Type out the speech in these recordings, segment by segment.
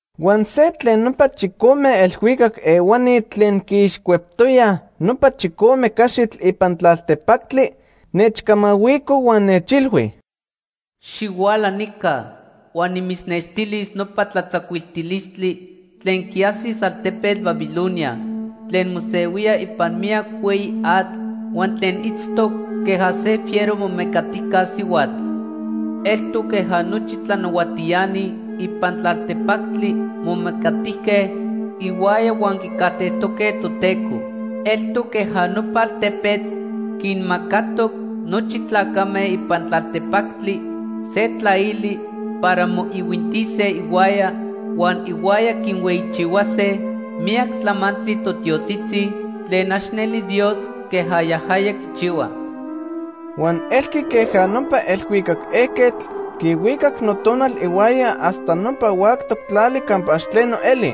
Huan se tlen nopa chicome elhuicac ehuani tlen quiixcueptoyaj nopa chicome caxitl ipan tlaltepactli, nechcamahuico huan nechilhui: “Xihuala nica huan nimitznextilis nopa tlatzacuiltilistli tlen quiajsis altepetl Babilonia tlen mosehuía ipan miyac hueyi atl huan tlen itztoc queja se fiero momecatijca sihuatl. Eltoc queja nochi tlanahuatiani ipan tlaltepactli momecatijque ihuaya huan quicajtejtoque Toteco. Eltoc queja nopa altepetl quinmacatoc nochi tlacame ipan tlaltepactli se tlaili para moihuintise ihuaya huan ihuaya quinhueyichihuase miyac tlamantli totiotzitzi tlen ax neli Dios queja yajaya quichihua.” Huan elqui queja nopa elhuicac ejquetl quihuicac notonal ihuaya hasta nopa huactoc tlali campa ax tleno eli.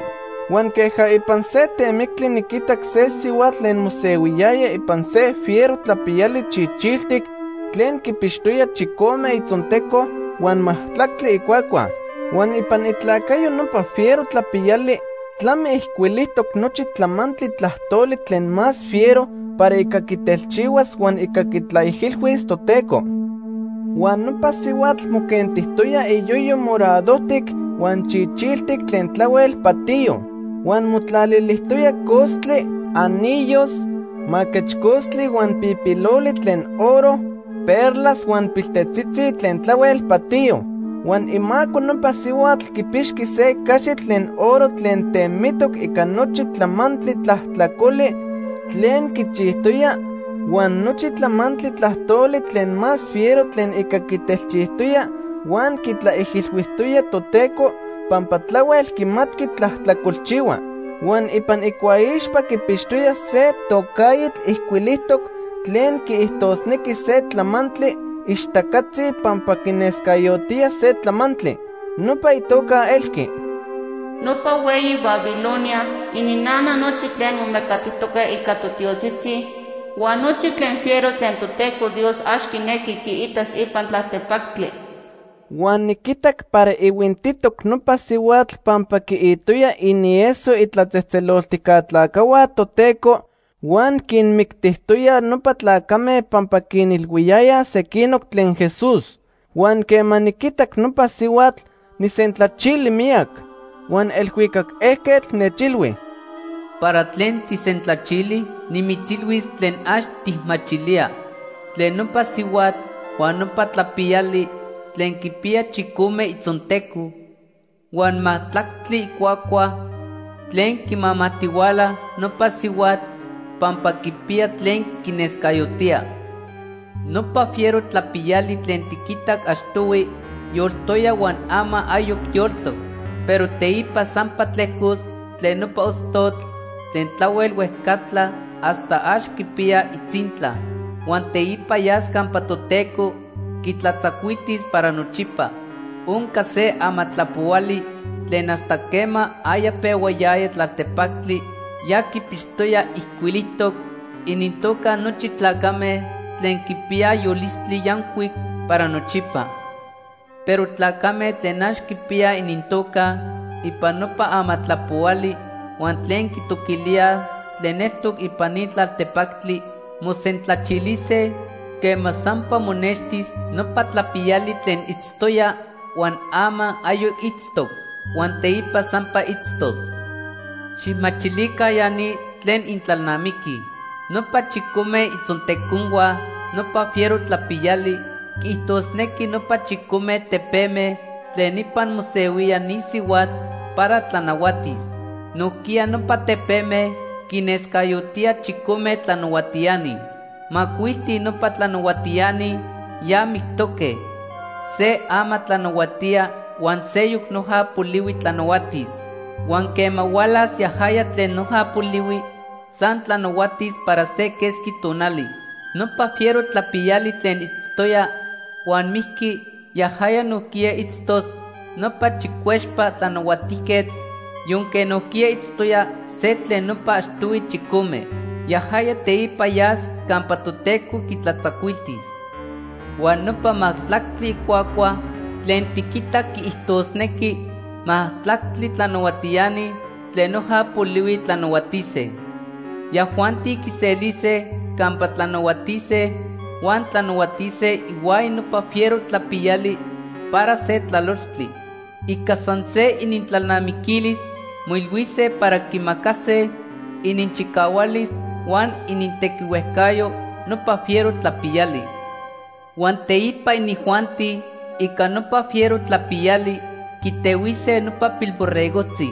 Huan queja ipan se temictli niquitac se sihuatl tlen mosehuiyaya ipan se fiero tlapiyali chichiltic tlen quipixtoya chicome itzonteco huan majtlactli icuacua. Huan ipan itlacayo nopa fiero tlapiyali tlami ijcuilijtoc nochi tlamantli tlajtoli tlen más fiero para ica quitelchihuas huan ica quitlaijilhuis Toteco. Huan nopa sihuatl moquentijtoya iyoyo moradojtic huan chichiltic tlen tlahuel patiyo. Huan motlalilijtoya costli, anillos, maquechcostli huan pijpiloli tlen oro, perlas huan piltetzitzi tlen tlahuel patiyo. Huan imaco nopa sihuatl quipixqui se caxitl tlen oro tlen temitoc ica nochi tlamantli tlajtlacoli tlen quichijtoya huan nochi tlamantli tlajtoli tlen más fiero tlen ica quitelchijtoya huan quitlaijilhuijtoya Toteco pampa tlahuel quimatqui tlajtlacolchihua. Huan ipan icuaixpa quipixtoya se tocaitl ijcuilijtoc tlen quiijtosnequi se tlamantli ixtacatzi pampa quinescayotía se tlamantli. Nopa itoca elqui: “Nopa hueyi Babilonia, ininnana nochi tlen momecatijtoque ica totiotzitzi, huan nochi tlen fiero tlen Toteco Dios ax quinequi quiitas ipan tlaltepactli.” Huan niquitac para ihuintitoc nopa sihuatl pampa quiitoya inieso itlatzejtzeloltijca tlacajhua Toteco huan quinmictijtoya nopa tlacame pampa quinilhuiyayaj sequinoc tlen Jesús. Huan quema niquitac nopa sihuatl, nijsentlachili miyac. Huan elhuicac ejquetl nechilhui: “¿Para tlen tijsentlachili? Nimitzilhuis tlen ax tijmachilía tlen nopa sihuatl huan nopa tlapiyali tlen quipiya chicome itzonteco huan majtlactli icuacua tlen quimamajtihuala nopa sihuatl pampa quipiya tlen quinescayotía. Nopa fiero tlapiyali tlen tiquitac achtohui yoltoya huan ama ayoc yoltoc. Pero teipa sampa tlejcos tlen nopa ostotl tlen tlahuel huejcatla hasta ax quipiya itzintla. Huan teipa yas campa Toteco quitlatzacuiltis para nochipa. Onca se amatlapohuali tlen hasta quema aya pehuayaya tlaltepactli ya quipixtoya ijcuilijtoc inintoca nochi tlacame tlen quipiyaj yolistli yancuic para nochipa. Pero tlacame tlen ax quipiyaj inintoca ipan nopa amatlapohuali huan tlen quitoquilíaj tlen eltoc ipan ni tlaltepactli mosentlachilise quema sampa monextis nopa tlapiyali tlen itztoya, huan ama ayoc itztoc, huan teipa sampa itztos. “Xijmachilica ya ni tlen intlalnamiquij. Nopa chicome itzonteconhua nopa fiero tlapiyali quiijtosnequi nopa chicome tepeme tlen ipan mosehuía ni sihuatl para tlanahuatis. Nojquiya nopa tepeme quinescayotíaj chicome tlanahuatiani. Macuilti nopa tlanahuatiani ya mictoque, se ama tlanahuatía huan seyoc noja polihui tlanahuatis. Huan quema hualas yajaya tlen noja polihui, san tlanahuatis para se quesqui tonali. Nopa fiero tlapiyali tlen itztoya huan mijqui, yajaya nojquiya itztos nopa chicuexpa tlanahuatijquetl, yonque nojquiya itztoya se tlen nopa achtohui chicome. Yajaya teipa yas campa Toteco quitlatzacuiltis. “Huan nopa majtlactli icuacua tlen tiquitac quiijtosnequi majtlactli tlanahuatiani tlen noja polihui tlanahuatise. Yajuanti quiselise campa tlanahuatise huan tlanahuatise ihuaya nopa fiero tlapiyali para se tlalochtli. Ica san se inintlalnamiquilis moilhuise para quimacase ininchicahualis huan inintequihuejcayo nopa fiero tlapiyali. Huan teipa inijuanti ica nopa fiero tlapiyali quitehuise nopa Pilborregojtzi.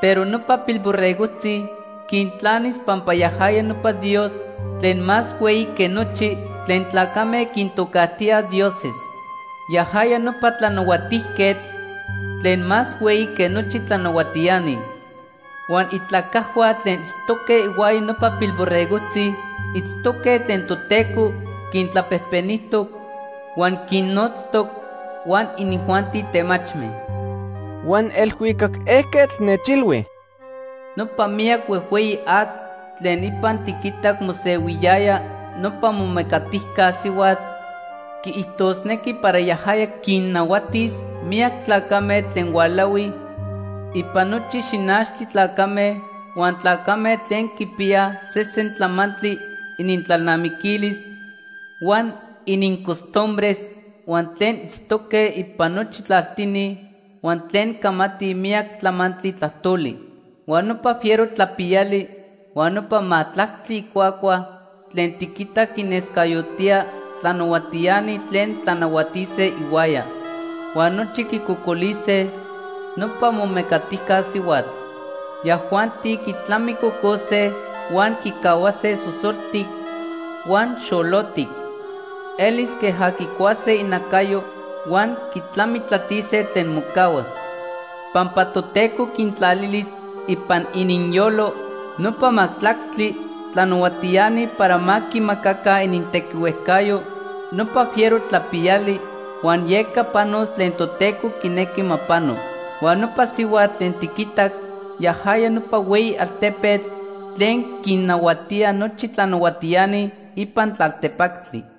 Pero nopa Pilborregojtzi quintlanis pampa yajaya nopa Dios tlen más hueyi que nochi tlen tlacame quintocajtíaj dioses. Yajaya nopa Tlanahuatijquetl tlen más hueyi que nochi tlanahuatiani. Huan itlacajhua tlen itztoque ihuaya nopa Pilborregojtzi itztoque tlen Toteco quintlapejpenijtoc huan quinnotztoc, huan inijuanti temachme.” Huan elhuicac ejquetl nechilhui: “Nopa miyac huejhueyi atl tlen ipan tiquitac mosehuiyaya nopa momecatijca sihuatl quiijtosnequi para yajaya quinnahuatis miyac tlacame tlen hualahuij ipan nochi xinachtli tlacame, huan tlacame tlen quipiyaj sesen tlamantli inintlalnamiquilis huan inincostumbres, huan tlen itztoque ipan nochi tlaltini, huan tlen camatij miyac tlamantli tlajtoli. Huan nopa fiero tlapiyali huan nopa majtlactli icuacua tlen tiquitac quinescayotía tlanahuatiani tlen tlanahuatise ihuaya. Huan nochi quicocolise nopa momecatijca sihuatl. Yajuanti quitlamicocose huan quicahuase sosoltic huan xolotic. Elis queja quicuase inacayo huan quitlamitlatise tlen mocahuas. Pampa Toteco quintlalilis ipan ininyolo nopa majtlactli tlanahuatiani para ma quimacaca inintequihuejcayo nopa fiero tlapiyali, huan yeca panos tlen Toteco quinequi ma pano. Huan nopa sihuatl tlen tiquitac yajaya nopa hueyi altepetl tlen quinnahuatía nochi tlanahuatiani ipan tlaltepactli.”